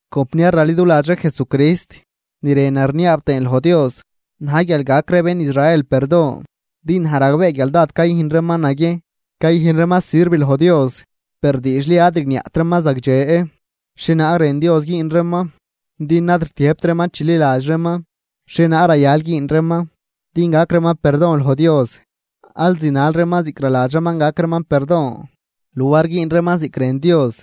Compniar raliduladx ree Jesucrist, ni rënan rniaab tëën loj Dios na̱j guial gac ree bén Israel perdon. Din naj ragbee guial dád cayüjn reeman naguiejn cayüjn reeman sirv loj Dios, per diidxli ad rigniaꞌt reeman zagdxe xhienaag rën Dios güün reeman. Din ad rtiëjbt reeman chililadx reeman xhienaag rayal güün reeman din gac reeman perdon loj Dios, al zinal reeman ziꞌc naladx reeman gac reeman perdon, luar güün reeman ziꞌc rën Dios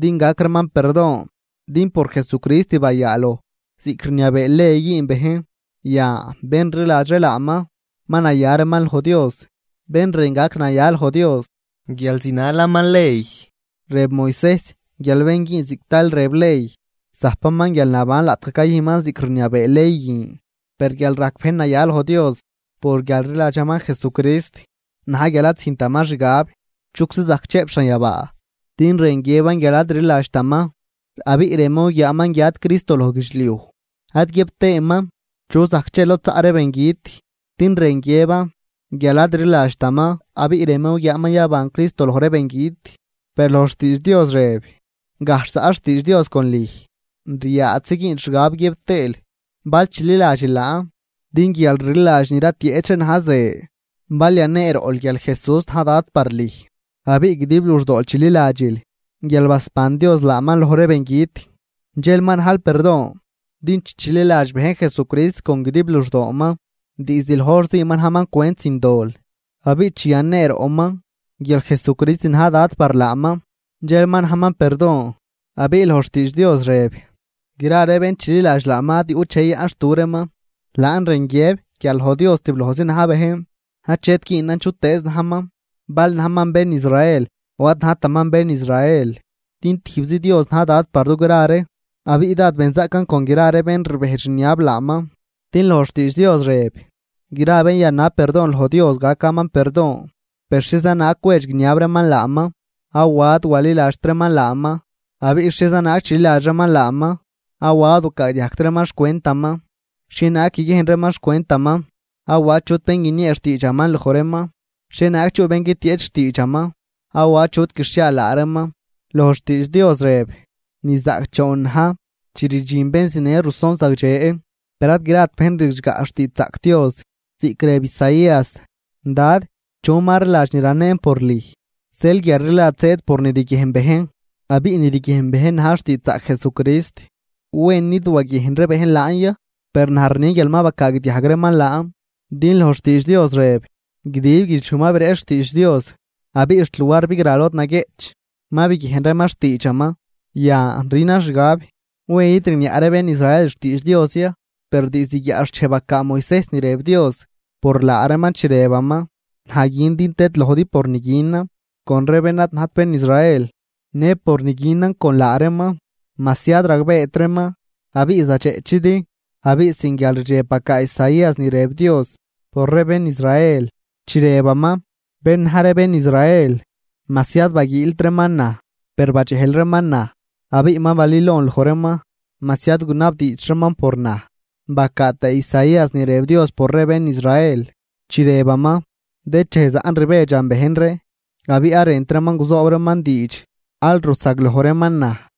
din gac reeman perdon. Din por Jesucrist bayaaloj ziꞌc rniabee ley güün bejn, yan bén rliladx ree laaman, ma naya reeman loj Dios. Bén rën gac naya loj Dios guial zinalaman ley, rëb Moisejs guial bén güün ziꞌc tal rëb ley, zajpaman guialnaban laꞌtgaj cayüjnman ziꞌc rniabee ley guin. Per guial rajc bejn naya loj Dios por guial rliladxaman Jesucrist, na̱j guial ad züjntaman xgab: “¿Chuczi zajc chëꞌp xanyabaa?” (Din rën guiëban guial ad rliladxtaman, abiꞌ rënman guguiaaman guiat Cristo loj guidxliuj.) Ad guiëb tëëman: “¿Chu zajc che lod zaꞌ ree bengüt?” (Din rën guiëban guial ad rliladxtaman, abiꞌ rënman guguiaaman yaban Cristo loj ree bengüt.) Per loj xtiidx Dios rëb: “Gajxh zaꞌ xtiidx Dios con lüj, ryaadxzi güünl xgab guiëb tëël bal chililadxil laan.” Din guialrliladx ni ratieꞌch ree na̱j ze. Bal yaneeroꞌl guial Jesús na̱j Dad par lüj abiꞌ guidib luxdool chililadxil guial basban Dios laaman loj ree bengüt, dxel ma najl perdon. Din chi chililadx bejn Jesucrist con guidib luxdooman, diizd loj hor zii ma najman cwent sin dol. Abiꞌ chi yaneeroꞌman guial Jesucrist na̱j Dad par laaman, dxel ma najman perdon. Abiꞌ loj xtiidx Dios rëb: “Gra ree bén chililadx laaman ad yuꞌt dxej yayaꞌnxtu reeman.” Laan rën guiëb guial loj Dios tiblojzi na̱j bejn, achet güünan chutëëz najman, bal najman bén Israel o ad najtaman bén Israel. Din tijbzi Dios na̱j Dad par dugra ree, abiꞌ dád benzaꞌcan con gra ree bén rbejdx rniab laaman. Din loj xtiidx Dios rëb: “Gra bén yanab perdon loj Dios, gacaman perdon.” Per, ¿xhieza naag cwedx guiniab reeman laaman awa ad waliladxt reeman laaman? ¿Abiꞌ xhieza naag chililadx reeman laaman awa ad wacaagdiajgt reeman xcwentaman? ¿Xhienaag guiguiejn reeman xcwentaman awa achut bén guiniee xtiidxaman loj reeman? ¿Xhienaag chuꞌ bén guitieꞌch xtiidxaman awa achut guixhiaal laa reeman? Loj xtiidx Dios rëb: “¡Ni zaꞌcdxoon na̱j chi rdxin bén zinë ruson zagdxe!” Per ad grat bejn ridxgaꞌ xtiidxzaꞌc Dios. Ziꞌc rëb Isaías: “Dad, ¿chu ma rliladx ni ranen por lüj?” Zeel guialrliladx zëëd por ni riguiejn bejn, abiꞌ ni riguiejn bejn na̱j xtiidxzaꞌc Jesucrist. ¿Wen nid waguiejn ree bejn laan ya? ¡Per naj rni guial ma bacaagdiajg reeman laan! Din loj xtiidx Dios rëb: Guidib guidxliuj ma bireꞌch xtiidx Dios abiꞌ xt luar bigra lod naguieꞌch ma biguiejn reeman xtiidxaman. Yan rünan xgab: ¿Wen id rigniaꞌ ree bén Israel xtiidx Dios ya? Per diizd guiaꞌxchej bacaa Moisejs ni rëb Dios por laa reeman chi rëbaman: Naj gün din tëdlojdi por ni günan con ree bén ad najt bén Israel. Në por ni günan con laa reeman, majsi ad ragbeet reeman, abiꞌ zadxeꞌchidi. Abiꞌ sin guialrdxeb bacaa Isaías ni rëb Dios por ree bén Israel, chi rëbaman: Bén na̱j ree bén Israel, majsi ad baguiilt reeman naj, per badxejl reeman naj. Abiꞌ ma balülon loj reeman, majsi ad gunabdiidxt reeman por naj. Bacaa tëë Isaías ni rëb Dios por ree bén Israel, chi rëbaman: “Dëchej zaꞌn rbedxan bejn ree abiꞌ ad rënt reeman guzoob reeman diidx al rusagloj reeman naj.”